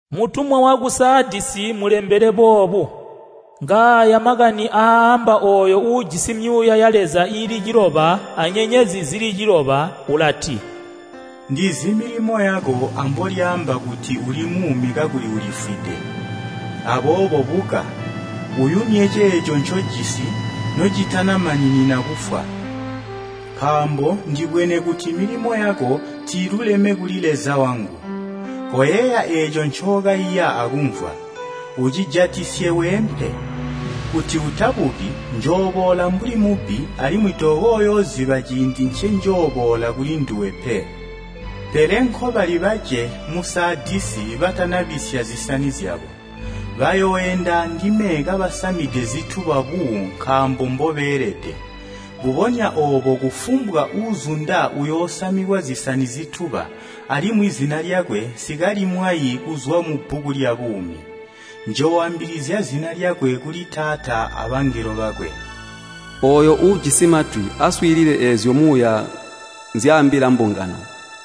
“Mutumwa waku Saadisi mulembele boobu: “Ngaaya makani aaamba ooyo uujisi myuuya ya Leza iili ciloba anyenyezi zili ciloba. Ulati, ndizi milimo yako ambolyaamba kuti uli muumi kakuli ulifwide! Aboobo buka, uyumye ceeco ncojisi nocitanamaninina kufwa. Nkaambo ndibwene kuti milimo yako tiiluleme kuli Leza wangu. Koyeeya eeco ncookaiya akumvwa, ucijatisye weempe. Kuti utabuki, njooboola mbuli mubbi, alimwi tokooyooziba ciindi ncenjooboola kulinduwe pe. Pele nkobali bace mu Saadisi batanabisya zisani zyabo. Bayooenda andime kabasamide zituba buu nkaambo mbobeelede. Mbubonya oobo kufumbwa uuzunda uyoosamikwa zisani zituba, alimwi zina lyakwe nsikalimwayi kuzwa mubbuku lyabuumi. Njooambilizya zina lyakwe kuli Taata abangelo bakwe. “Ooyo uujisi matwi, aswiilile eezyo Muuya nzyaambila mbungano!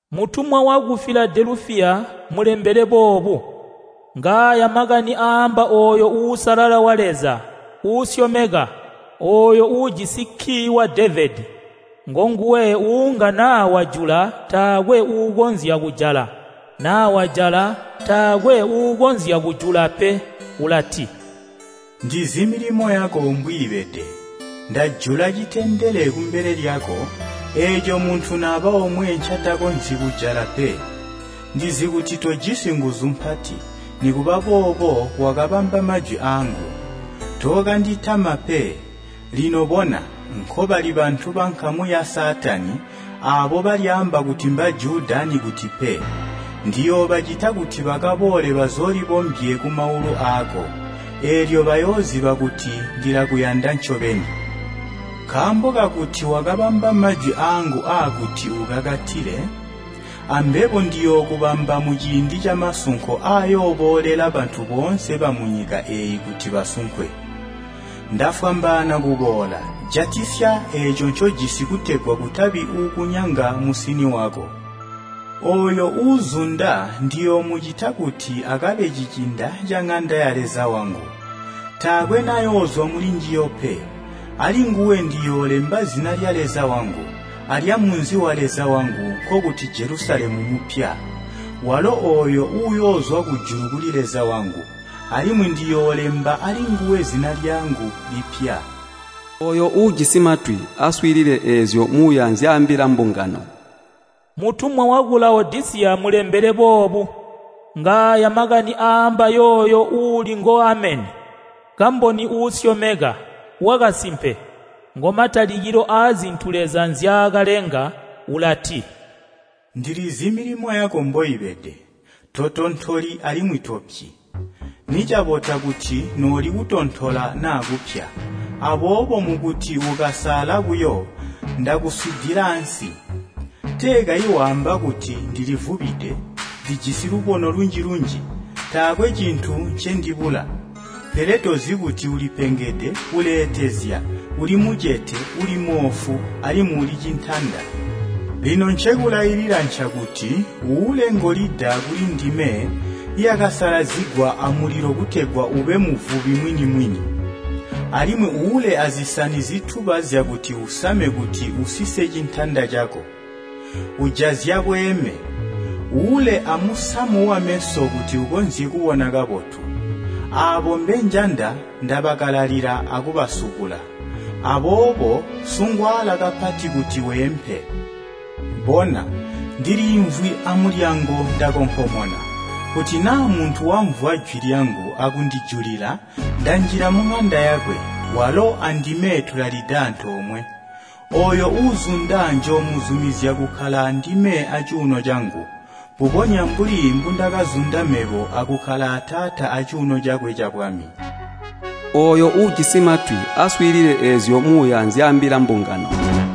“Mutumwa waku Filadelufiya mulembele boobu: “Ngaaya makani aaamba ooyo Uusalala wa Leza, uusyomeka, ooyo uujisi kkii wa Devedi. Ngonguwe uunga naa wajula taakwe uukonzya kujala, naa wajala taakwe uukonzya kujula pe. Ulati, ndizi milimo yako mbwiibede. Ndajula citendele kumbele lyako, eeco muntu naba omwe ncatakonzyi kujala pe. Ndizi kuti tojisi nguzu mpati, nikuba boobo wakabamba majwi aangu, tookanditama pe. Lino bona, nkobali bantu bankamu ya Saatani, aabo balyaamba kuti Mbajuda anikuti pe. Ndiyoobacita kuti bakaboole bazoolibombye kumaulu aako. Eelyo bayooziba kuti ndilakuyanda ncobeni. Nkaambo kakuti wakabamba majwi aangu aakuti ukakatile, ambebo ndiyookubamba muciindi camasunko aayooboolela bantu boonse bamunyika eeyi kuti basunkwe. Ndafwambaana kuboola, jatisya eeco ncojisi kutegwa kutabi uukunyanga musini wako. Ooyo uuzunda ndiyoomucita kuti akabe cicinda caŋanda ya Leza wangu, taakwe nayoozwa mulinjiyo pe. Alinguwe ndiyoolemba zina lya Leza wangu, alyamunzi wa Leza wangu, nkokuti Jelusalemu mupya, walo ooyo uyoozwa kujulu kuli Leza wangu. Alimwi ndiyoolemba alinguwe zina lyangu lipya. “Ooyo uujisi matwi, aswiilile eezyo Muuya nzyaambila mbungano! “Mutumwa waku Lawodisiya mulembele boobu: “Ngaaya makani aaamba yooyo uuli ngo Ameni, kamboni uusyomeka, wakasimpe. Ngomatalikilo aazintu Leza nzyaakalenga. Ulati, ndilizi milimo yako mboibede, totontoli alimwi topyi. Nicabota kuti nooli kutontola naa kupya. Aboobo mukuti ukasaala buyo, ndakuswiidila ansi. Tee kayi waamba kuti, ‘Ndilivubide, ndijisi lubono lunji-lunji, taakwe cintu ncendibula.’ Pele tozi kuti ulipengede uleetezya, uli mucete, uli moofu, alimwi uli cintanda. Lino ncekulailila ncakuti uule ngolida kulindime yakasalazigwa amulilo kutegwa ube muvubi mwini-mwini. Alimwi uule azisani zituba zyakuti usame kuti usise cintanda cako, ujazya bweeme. Uule amusamu wameso kuti ukonzye kubona kabotu. Aabo mbenjanda ndabakalalila akubasubula. Aboobo sungwaala kapati kuti weempe. Bona, ndiliimvwi amulyango ndakonkomona, kuti naa muntu wamvwa jwi lyangu akundijulila, ndanjila muŋanda yakwe, walo andime tulalida antoomwe. Ooyo uuzunda njoomuzumizya kukkala andime acuuno cangu, mbubonya mbuli mbundakazunda mebo akukkala a Taata acuuno cakwe cabwami. “Ooyo uujisi matwi, aswiilile eezyo Muuya nzyaambila mbungano!”